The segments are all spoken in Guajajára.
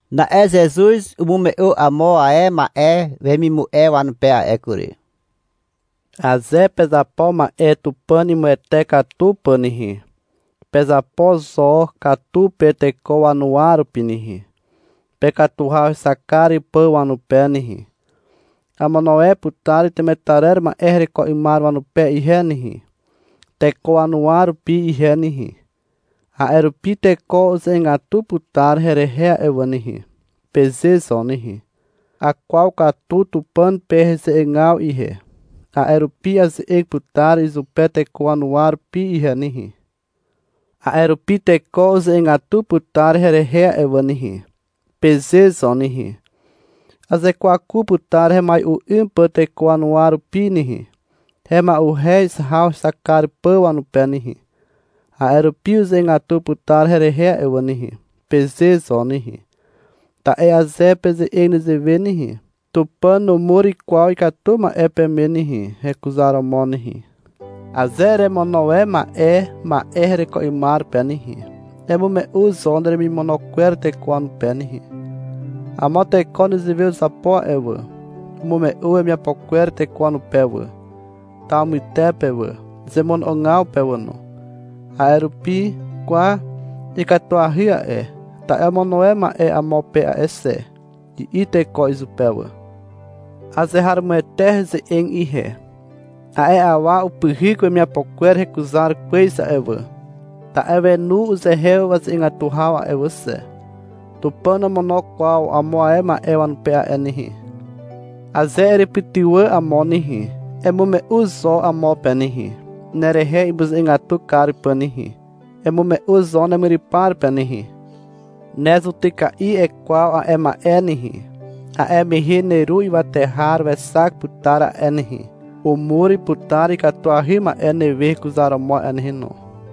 (Na'e Zezuz umume'u amo ae ma'e wemimu'e wanupe a'e kury.) — Aze pezapo ma'e Tupàn imuwete katu pà nehe, pezapo zo katu pe teko wanuwa rupi nehe, pekatu haw hexak kar pà wanupe nehe. — Amono e putar temetarer ma'e hereko 'ymar wanupe ihe nehe, teko wanuwa rupi ihe nehe. A'e rupi teko uze'egatu putar herehe a'e wà nehe, peze zo nehe. — Akwaw katu Tupàn pe heze'egaw ihe, a'e rupi aze'eg putar izupe teko wanuwa rupi ihe nehe. A'e rupi teko uze'egatu putar herehe a'e wà nehe, peze zo nehe. — Azekwaku putar hemai'u 'ym pà teko wanuwa rupi nehe, hema'uhez haw hexak kar pà wanupe nehe, a'e rupi uze'egatu putar herehe a'e wà nehe, peze zo nehe. Ta'e aze peze'eg nezewe nehe, Tupàn numur kwaw ikatu ma'e peme nehe, hekuzaromo nehe. Aze eremono e ma'e ma'e hereko 'ymar pe nehe, emume'u zo neremimono kwer teko wanupe nehe. Amo teko nezewe uzapo a'e wà. Umume'u wemiapo kwer teko wanupe wà, taw mytepe wà, zemono'ogaw pe wà no. A'e rupi — Kwa, ikatuahy a'e, ta'e omono e ma'e amo pe a'e xe, i'i teko izupe wà. Azeharomoete heze'eg ihe. A'e awa upyhyk wemiapo kwer hekuzar kwez a'e wà, (ta'e wenu uzehe waze'egatu haw a'e wà xe). Tupàn nomono kwaw amo ae ma'e wanupe a'e nehe. Aze erepytywà amo nehe, emume'u zo amo pe nehe, nerehe imuze'egatu kar pà nehe. Emume'u zo nemyrypar pe nehe. Ne zutyka'i ekwaw a'e ma'e nehe. A'e mehe neru ywate har wexak putar a'e nehe, umur putar ikatuahy ma'e newe hekuzaromo a'e nehe no.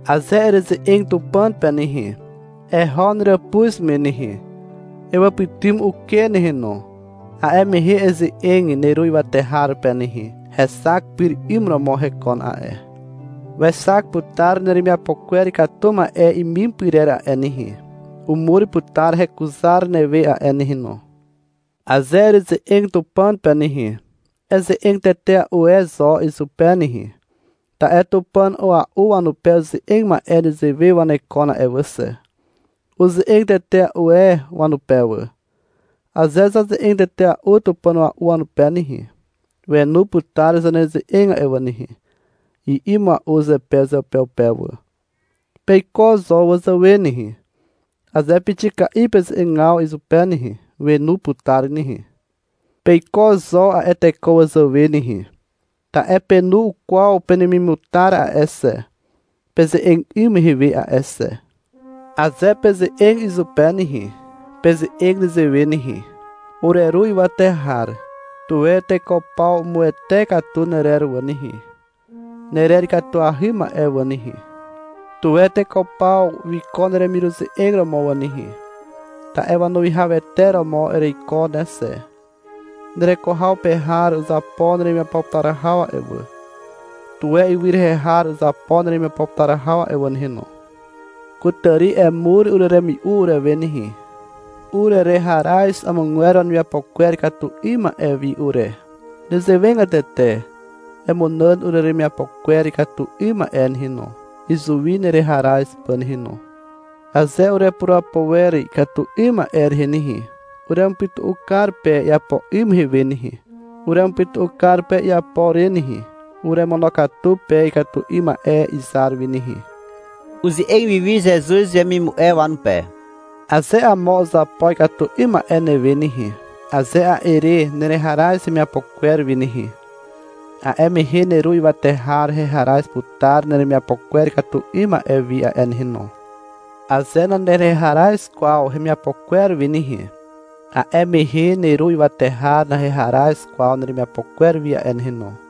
Aze ereze'eg Tupàn pe nehe, eho neràpuz me nehe, ewàpytym uken nehe no. A'e mehe eze'eg neru ywate har pe nehe. Hexak pyr 'ym romo hekon a'e. Wexak putar neremiapo kwer ikatu ma'e imim pyrer a'e nehe. Umur putar hekuzar newe a'e nehe no. Aze ereze'eg Tupàn pe nehe, eze'eg tetea'u e zo izupe nehe, ta'e Tupàn a'ua'u wanupe uze'eg ma'e nezewe wanekon a'e wà xe. Uze'eg tetea'u e wanupe wà. — Aze zaze'eze'eg tetea'u tupàn a'ua'u wanupe nehe, wenu putar zaneze'eg a'e wà nehe, i'i mua'u zepe uzeupeupe wà. Peiko zo wazàwe nehe. Aze pixika'i peze'egaw izupe nehe, wenu putar nehe. Peiko zo a'e teko wazàwe nehe, ta'e penu ukwaw penemimutar a'e xe, peze'eg 'ym mehe we a'e xe. Aze peze'eg izupe nehe, peze'eg nezewe nehe. Ureru ywate har, Tuwe teko paw umuwete katu nerer wà nehe, Nerer ikatuahy ma'e wà nehe. Tuwe teko paw wiko neremiruze'eg romo wà nehe. Ta'e wanuwihawete romo ereiko ne xe. Nereko haw pe har uzapo neremiapo putar haw a'e wà. Tuwe ywy rehe har uzapo neremiapo putar haw a'e wà nehe no. Kutàri emur ureremi'u urewe nehe. Urereharaz amogwer wanemiapo kwer ikatu 'ym ma'e wi ure. Nezewegatete, emunàn ureremiapo kwer ikatu 'ym ma'e nehe no, izuwi nereharaz pà nehe no. Aze urepurapo wer ikatu 'ym ma'e rehe nehe, Uremupytu'u kar pe iapo 'ym mehe we nehe. Uremupytu'u kar pe iapo re nehe. Uremonokatu pe ikatu 'ym ma'e izar wi nehe. Uze'eg wiwi Zezuz wemimu'e wanupe. — Aze amo uzapo ikatu 'ym ma'e newe nehe, aze a'e re nereharaz hemiapo kwer wi nehe, a'e mehe neru ywate har heharaz putar neremiapo kwer ikatu 'ym ma'e wi a'e nehe no. Aze nanereharaz kwaw hemiapo kwer wi nehe, a'e mehe neru ywate har naheharaz kwaw neremiapo kwer wi a'e nehe no.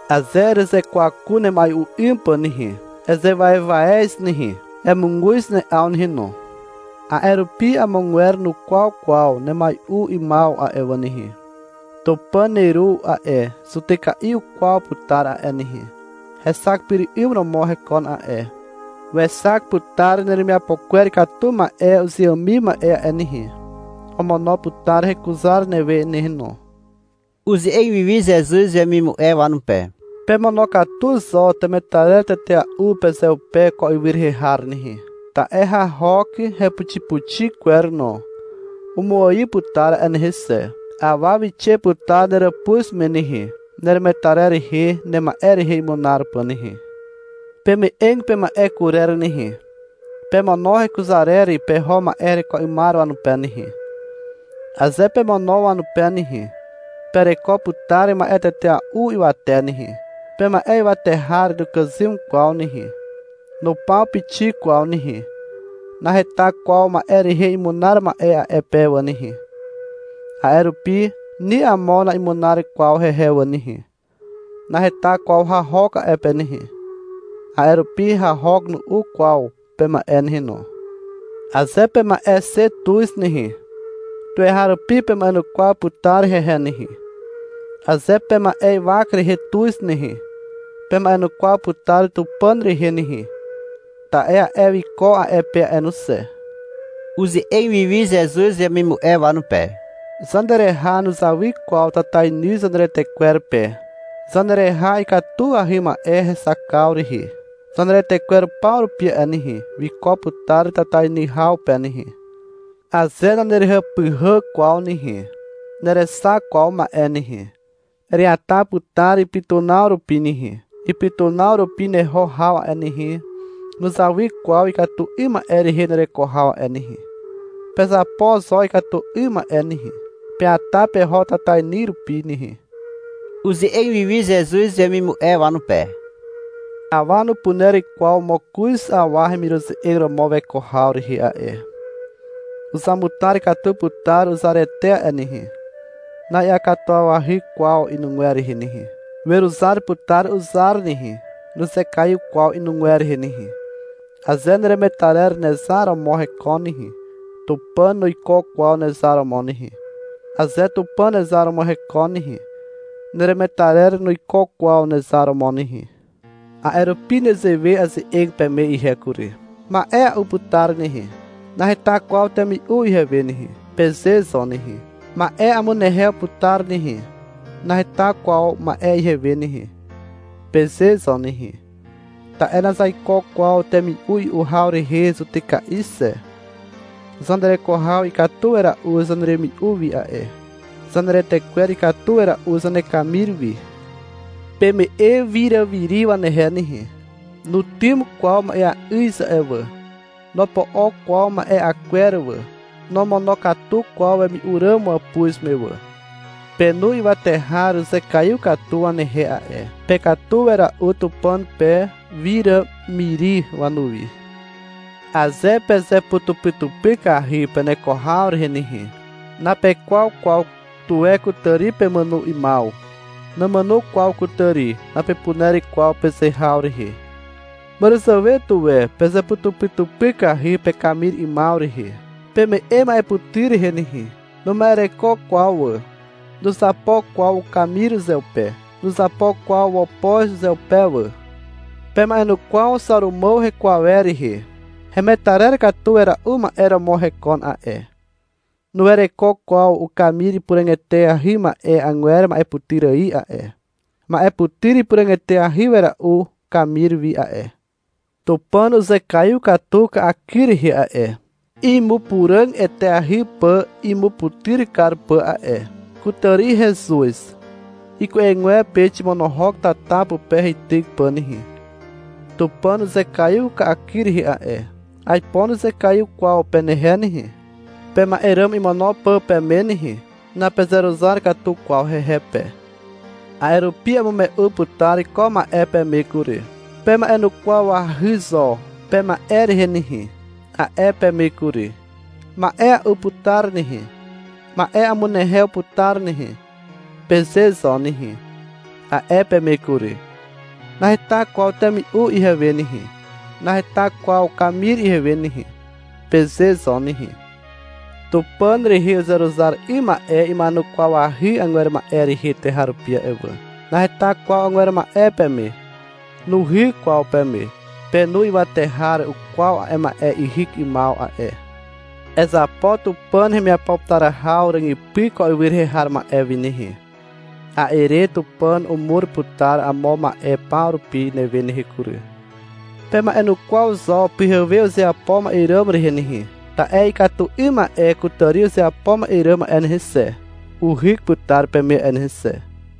Aze erezekwaku nemai'u 'ym pà nehe, ezewaewaez nehe, emuguz ne'aw nehe no. A'e rupi amogwer nukwaw kwaw nemai'u 'ymaw a'e wà nehe. Tupàn neru a'e zutyka'i ukwaw putar a'e nehe. Hexak pyr 'ym romo hekon a'e. Wexak putar neremiapo kwer ikatu ma'e uzeàmim ma'e a'e nehe. Omono putar hekuzar newe nehe no. (Uze'eg wiwi Zezuz wemimu'e wanupe.) — Pemono'ogatu zo temetarer tetea'u pezeupe ko ywy rehe har nehe. Ta'e hahok, hepuxipuxi kwer no, umuaiw putar a'e nehe xe. Awa wixe putar neràpuz me nehe, neremetarer rehe nema'e rehe imunar pà nehe. Peme'eg pema'e kurer nehe. Pemono hekuzarer peho ma'e hereko 'ymar wanupe nehe. Aze pemono wanupe nehe, pereko putar ma'e tetea'u ywate nehe. Pema'e ywate har nukàzym kwaw nehe. Nupaw pixik kwaw nehe. Naheta kwaw ma'e rehe imunar ma'e a'e pe wà nehe. A'e rupi ni amo na'imunar kwaw hehe wà nehe. Naheta kwaw hahok a'e pe nehe. A'e rupi hahok nu'u kwaw pema'e nehe no. Aze pema'e xe tuz nehe, tuweharupi pema'enukwaw putar hehe nehe. Aze pema'e ywak rehe tuz nehe, pema'enukwaw putar Tupàn rehe nehe, ta'e a'e wiko a'e pe a'e no xe. (Uze'eg wiwi Zezuz wemimu'e wanupe.) — Zanereha nuzawy kwaw tatainy zaneretekwer pe. Zanereha ikatuahy ma'e hexakaw rehe, zaneretekwer paw rupi a'e nehe, wiko putar tatainy haw pe nehe. Aze nanerehàpyhà kwaw nehe, nerexak kwaw ma'e nehe. Ereata putar ipytunaw rupi nehe. Ipytunaw rupi neho haw a'e nehe, nuzawy kwaw ikatu 'ym ma'e rehe nereko haw a'e nehe. Pezapo zo ikatu 'ym ma'e nehe. Peata peho tatainy rupi nehe. (Uze'eg wiwi Zezuz wemimu'e wanupe.) — Awa nupuner kwaw mokoz awa hemiruze'eg romo weko haw rehe a'e. Uzamutar katu putar uzarete a'e nehe. Na'iakatuwawahy kwaw inugwer rehe nehe. Weruzar putar uzar nehe, nuzekaiw kwaw inugwer rehe nehe. Aze neremetarer nezar romo hekon nehe, Tupàn nuiko kwaw nezar romo nehe. Aze Tupàn nezar romo hekon nehe, neremetarer nuiko kwaw nezar romo nehe. A'e rupi nezewe aze'eg peme ihe kury. — Ma'e a'u putar nehe. Naheta kwaw temi'u ihewe nehe, peze zo nehe. — Ma'e amunehew putar nehe. Naheta kwaw ma'e ihewe nehe, peze zo nehe. Ta'e nazaiko kwaw temi'u i'u haw rehe zutyka'i xe. Zanereko haw ikatu wera'u zaneremi'u wi a'e. Zaneretekwer ikatu wera'u zanekamir wi. Peme'e wiràmiri wanehe nehe. Nutym kwaw ma'eà'yz a'e wà. Nopo'o kwaw ma'e'a kwer wà. Nomonokatu kwaw wemi'u ràm wàpuz me wà. Penu ywate har uzekaiw katu wanehe a'e. Pekatu wera'u Tupàn pe wiràmiri wanuwi. Aze pezeputupykahy peneko haw rehe nehe, napekwaw kwaw tuwe kutàri pemàno 'ymaw. — Nàmàno kwaw kutàri, napepuner kwaw peze haw rehe. Màràzàwe tuwe pezeputupykahy pekamir 'ymaw rehe. Peme'e ma'eputyr rehe nehe. Numa'ereko kwaw wà. Nuzapo kwaw ukamir uzeupe. Nuzapo kwaw wopoz uzeupe wà. Pema'enukwaw Xàrumàw heko awer rehe. Hemetarer katu wera'u ma'e romo hekon a'e. Nuwereko kwaw ukamir ipuràg eteahy ma'e agwer ma'eputyr ài a'e. Ma'e putyr ipuràg eteahy wera'u ikamir wi a'e. Tupàn uzekaiw katu ka'akyr rehe a'e, imupuràg eteahy pà imuputyr kar pà a'e. Kutàri hezuz. Iku'egwepe ximonohok tata pupe heityk pà nehe. Tupàn uzekaiw ka'akyr rehe a'e. Aipo nuzekaiw kwaw penehe nehe, pema'e ràm imono pà peme nehe. Napezeruzar katu kwaw hehe pe. A'e rupi amume'u putar ko ma'e peme kury. — Pema'enukwawahy zo pema'e rehe nehe, a'e peme kury. — Ma'e a'u putar nehe, ma'e amunehew putar nehe, peze zo nehe, a'e peme kury. — Naheta kwaw temi'u ihewe nehe, naheta kwaw kamir ihewe nehe, peze zo nehe. Tupàn rehe uzeruzar 'ym ma'e ima'enukwawahy agwer ma'e rehe tuweharupi a'e wà. Naheta kwaw agwer ma'e peme. Nuhyk kwaw peme. Penu ywate har ukwaw a'e ma'e ihyk 'ymaw a'e. Ezapo Tupàn hemiapo putar haw ràgypy ko ywy rehe har ma'e wi nehe. A'e re Tupàn umur putar amo ma'e paw rupi newe nehe kury. Pema'enukwaw zo pyhewe uzeapo ma'e ràm rehe nehe. Ta'e ikatu 'ym ma'e kutàri uzeapo ma'e ràm a'e nehe xe, uhyk putar peme a'e nehe xe.